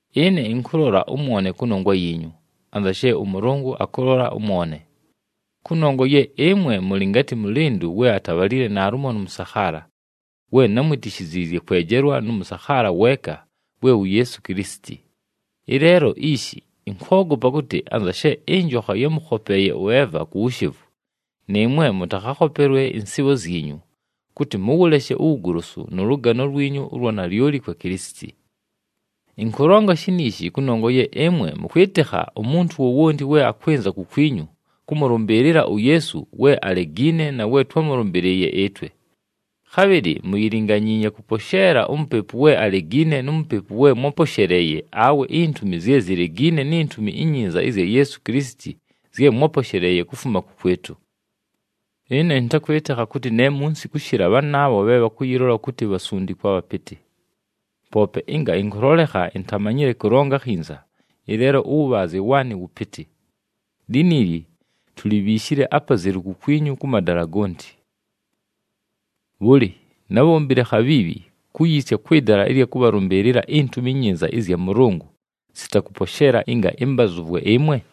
Ɨne ɨnkʉlola ʉmwone kʉnongwa yiinyu, anza she ʉMʉlʉngʉ akʉlola ʉmwone. Kʉnongwa ye ɨmwe mʉlɨ ngatɨ mʉlɨndʉ we atabhalile naalumo nʉ mʉsakhaala, we námwitishiziizye kwejelwa nʉ mʉsakhaala weeka, we wu Yeesu Kilisiti. Ɨleelo ishi ɨnkwogopa kʉtɨ, anza she ɨnjokha yámʉkhopeeye ʉEva ku wushevu, nɨɨmwe mʉtakhakhopelwe ɨnsɨɨbho zyinyu, kʉtɨ mʉwʉleshe uwugolosu nʉ lʉgano lwinyu ʉlwa nalyoli kwa Kilisiti. Ɨnkʉlonga shiniishi kʉnongwa ye ɨmwe mʉkwɨtɨkha umuntu wowonti we akwɨnza kukwinyu kʉmʉlʉmbɨɨlɨla uYeesu we alegiine na we twámʉlʉmbɨlɨɨye ɨtwe. Khabhɨlɨ muyilinganyiinye kʉposheela umupepu we alegiine nu Mupepu we mwáposheleeye awe intumi zye zilegiine ni Ntumi iNyinza ɨzya Yeesu Kilisiti zye mwáposheleeye kufuma kʉkwɨtʉ! Ɨne ɨntakwɨtɨkha kʉtɨ ne munsi kʉshɨla bhanaabho bhe bhakʉyɨlola kʉtɨ, “bhasundikwa bhapɨtɨ.” Poope ɨnga ɨnkʉlolekha intamanyile kʉlonga akhinza, ɨleelo ʉwʉbhaazye waanɨ wʉpɨtɨ. Liniili tulibhiishile apazelu kukwinyu kʉ madala gonti. Bhʉlɨ, nábhombile akhabhiibhi kuyiisya kwɨ dala ɨlya kʉbhalʉmbɨɨlɨla iNtumi iNyinza ɨzya Mʉlʉngʉ sita kʉposheela ɨnga ɨmbazʉvwe ɨmwe?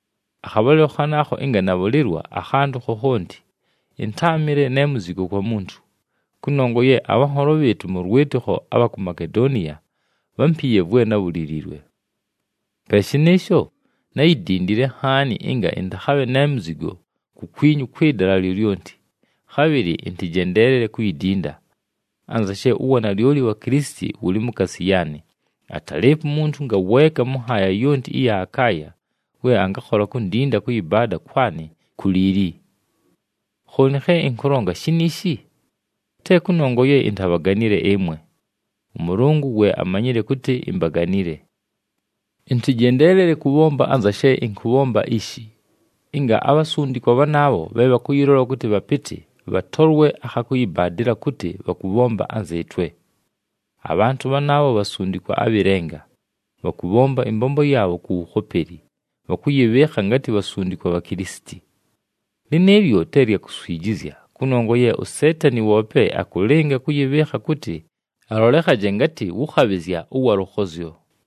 Akhabhalɨlo khanaakho, ɨnga nabhʉlɨlwa akhantʉ khokhonti, ɨntáamɨle ne muzigo kwa muntu, kʉnongwa ye abhanholo bhɨɨtʉ mʉ lwɨtɨkho abha ku Makedoniya bhámpiiye vwe nábhuliliilwe. Pe shɨnɨɨsho, náyidindile nhaani ɨnga ɨntakhabhe ne muzigo kukwinyu kwɨ dala lyolyonti, khabhɨlɨ ɨntɨjendeelele kuyidinda. Anza she uwanalyoli wa Kilisiti wʉlɨ mukaasi yaanɨ, atalɨɨpo umuntu ngaweeka mʉ nhaaya yonti ɨya Akaaya, we angakhola kundinda kʉyɨbaada kwanɨ ku liili. Khooni khe ɨnkʉlonga shiniishi? Te kʉnongwa ye intabhaganile ɨmwe. ɄMʉlʉngʉ we amanyile kʉtɨ imbaganile. Ɨntɨjendeelele kʉbhomba anza she ɨnkʉbhomba ishi, ɨnga abhasundikwa bhanaabho bhe bhakʉyɨlola kʉtɨ bhapɨtɨ, bhatolwe akha kʉyɨbaadɨla kʉtɨ bhakʉbhomba anzɨɨtwe. Abhantʉ bhanaabho bhasundikwa abhɨ lenga, bhakʉbhomba ɨmbombo yaabho ku wukhopeli, bhakʉyɨbhɨɨkha ngatɨ bhasundikwa bha Kilisiti. Lɨnɨɨlyo te lya kuswijizya, kʉnongwa ye uSeetani woope akʉlɨnga kʉyɨbhɨɨkha kʉtɨ alolekhaje ngatɨ wʉ khabhɨzya ʉwa lʉkhozyo.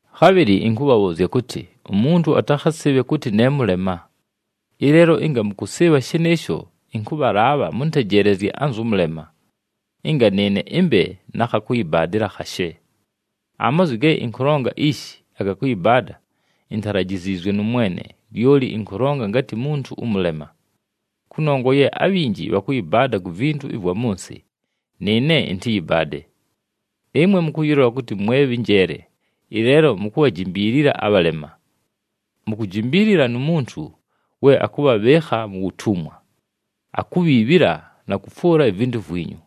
Khabhɨlɨ ɨnkʉbhabhʉʉzya kʉtɨ, umuntu atakhasɨɨbhe kʉtɨ ne mʉlema! Ɨleelo ɨnga mʉkʉsɨɨbha shɨnɨɨsho, ɨnkʉbhalaabha mʉntejeelezye anzʉ mʉlema, ɨnga nɨɨne ɨmbe na kha kʉyɨbaadɨla khashe. Amazwi ge ɨnkʉlonga ishi aga kʉyɨbaada, intalajiziizwe nʉ Mwene, lyoli ɨnkʉlonga ngatɨ muntu ʉmʉlema. Kʉnongwa ye abhinji bhakʉyɨbaada ku vintu ɨvwa mʉ nsɨ, nɨɨne ɨntɨyɨbaade. Ɨmwe mʉkʉyɨlola kʉtɨ mwe bhɨ njeele, ɨleelo mukubhajimbiilila abhalema! Mukujimbiilila nu muntu we akʉbhabhɨɨkha mu wutumwa, akubhiibhila na kʉfwʉla ivintu vwinyu,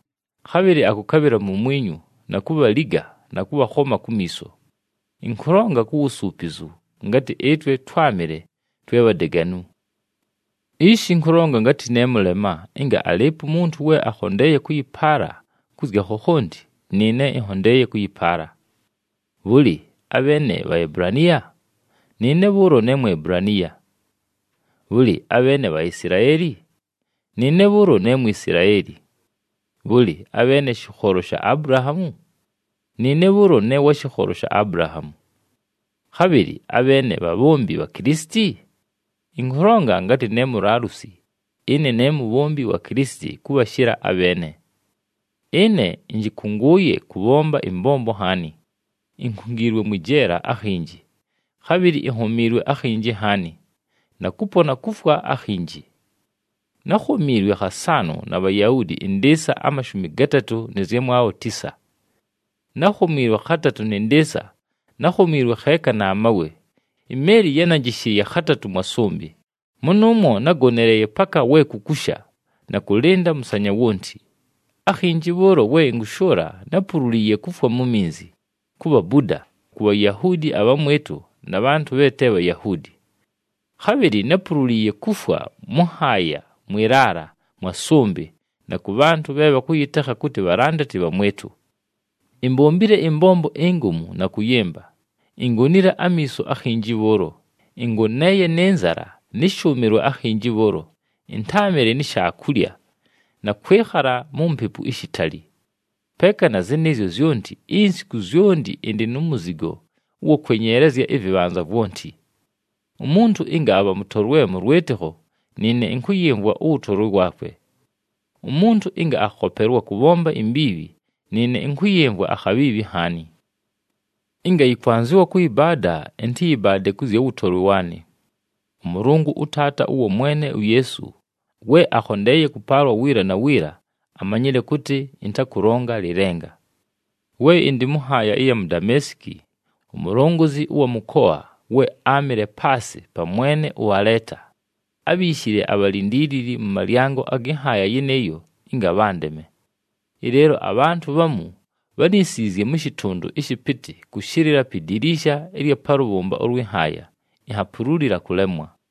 khabhɨlɨ akʉkabhɨla mumwinyu na kubhaliga na kʉbhakhoma kumiiso. Ɨnkʉlonga ku wusuupizu ngatɨ ɨtwe twámɨle twe bhadeganu. Ishi ɨnkʉlonga ngatɨ ne mʉlema, ɨnga alɨɨpo umuntu we akhondeeye kʉyɨpaala kʉ zya khokhonti, nɨɨne ɨnhondeeye kʉyɨpaala. Bhʉlɨ, abheene Bhaebulaniya? Nɨɨne bhʉʉlo ne Muebulaniya. Bhʉlɨ, abheene Bhaisilaeli? Nɨɨne bhʉʉlo ne Mwisilaeli. Bhʉlɨ, abheene shɨkholo sha Abulahaamu? Nɨɨne bhʉʉlo ne wa shɨkholo sha Abulahaamu. Khabhɨlɨ abheene bhabhombi bha Kilisiti? Ɨnkʉlonga ngatɨ ne mulaalusi, ɨne ne mubhombi wa Kilisiti kʉbhashɨla abheene. Ɨne ɨnjɨkʉngʉʉye kʉbhomba ɨmbombo nhaani, inkungiilwe mwɨ jeela akhinji, khabhɨlɨ inhomiilwe akhinji nhaani, na kʉpona kufwa akhinji. Nákhomiilwe khasaanʉ na Bhayahuudi ɨndɨɨsa amashumi gatatʉ nɨ zyamwabho tisa. Nákhomiilwe khatatʉ nɨ ndɨɨsa, nákhomiilwe kheeka na mawe, imeeli yánanjɨshɨɨye khatatʉ mwa sʉmbɨ, mʉnʉʉmwo nágoneleeye paka we kukusha na kʉlɨnda mʉsanya wonti. Akhinji bhʉʉlo we ɨnkʉshʉʉla, nápululiiye kufwa mu nyiizi, ku bhabuda, ku Bhayahuudi abhamwɨtʉ na bhantʉ bhe te Bhayahuudi. Khabhɨlɨ nápululiiye kufwa mʉ nhaaya, mwɨ laala, mwa sʉmbɨ, na kʉ bhantʉ bhe bhakʉyɨtekha kʉtɨ bhalandati bhamwɨtʉ. Imbombile ɨmbombo ingomu na kʉyɨmba, ingonile amiiso akhinji bhʉʉlo, ɨngoneeye nɨ nzala nɨ shʉʉmɨlwa akhinji bhʉʉlo, ɨntáamɨle ni shaakulya, na kwɨkhala mu mpepu ishitali. Peeka na zɨnɨɨzyo zyonti, insiku zyonti ɨndɨ nu muzigo ʉwa kwenyeelezya ɨvɨbhanza vwonti. Umuntu ɨnga abha mʉtolwe mʉ lwɨtɨkho, nɨɨne ɨnkʉyɨmvwa ʉwʉtolwe waakwe. Umuntu ɨnga akhopelwa kʉbhomba imbiibhi, nɨɨne ɨnkʉyɨmvwa akhabhiibhi nhaani. Ɨnga yɨkwanzɨwa kʉyɨbaada, ɨntɨyɨbaade kʉ zya wʉtolwe waanɨ. ɄMʉlʉngʉ, ʉTaata ʉwa Mwene uYeesu, we akhondeeye kʉpaalwa wiila na wiila, amanyile kʉtɨ ɨntakʉlonga lɨlenga. We ɨndɨ mʉ nhaaya ɨya mu Dameesiki, umulongozi ʉwa mʉkoa, we áamɨle paasɨ pa mwene ʉAleeta, ábhiishile abhalindiilili mʉ malyango agɨ nhaaya yɨnɨɨyo ɨnga bhandeme. Ɨleelo abhantʉ bhamu bhánisiizye mʉ shɨtʉndʉ ɨshɨpɨtɨ kʉshɨlɨla pi diliisha ɨlya pa lʉbhʉmba ʉlwɨ nhaaya, inhapululila kʉlemwa.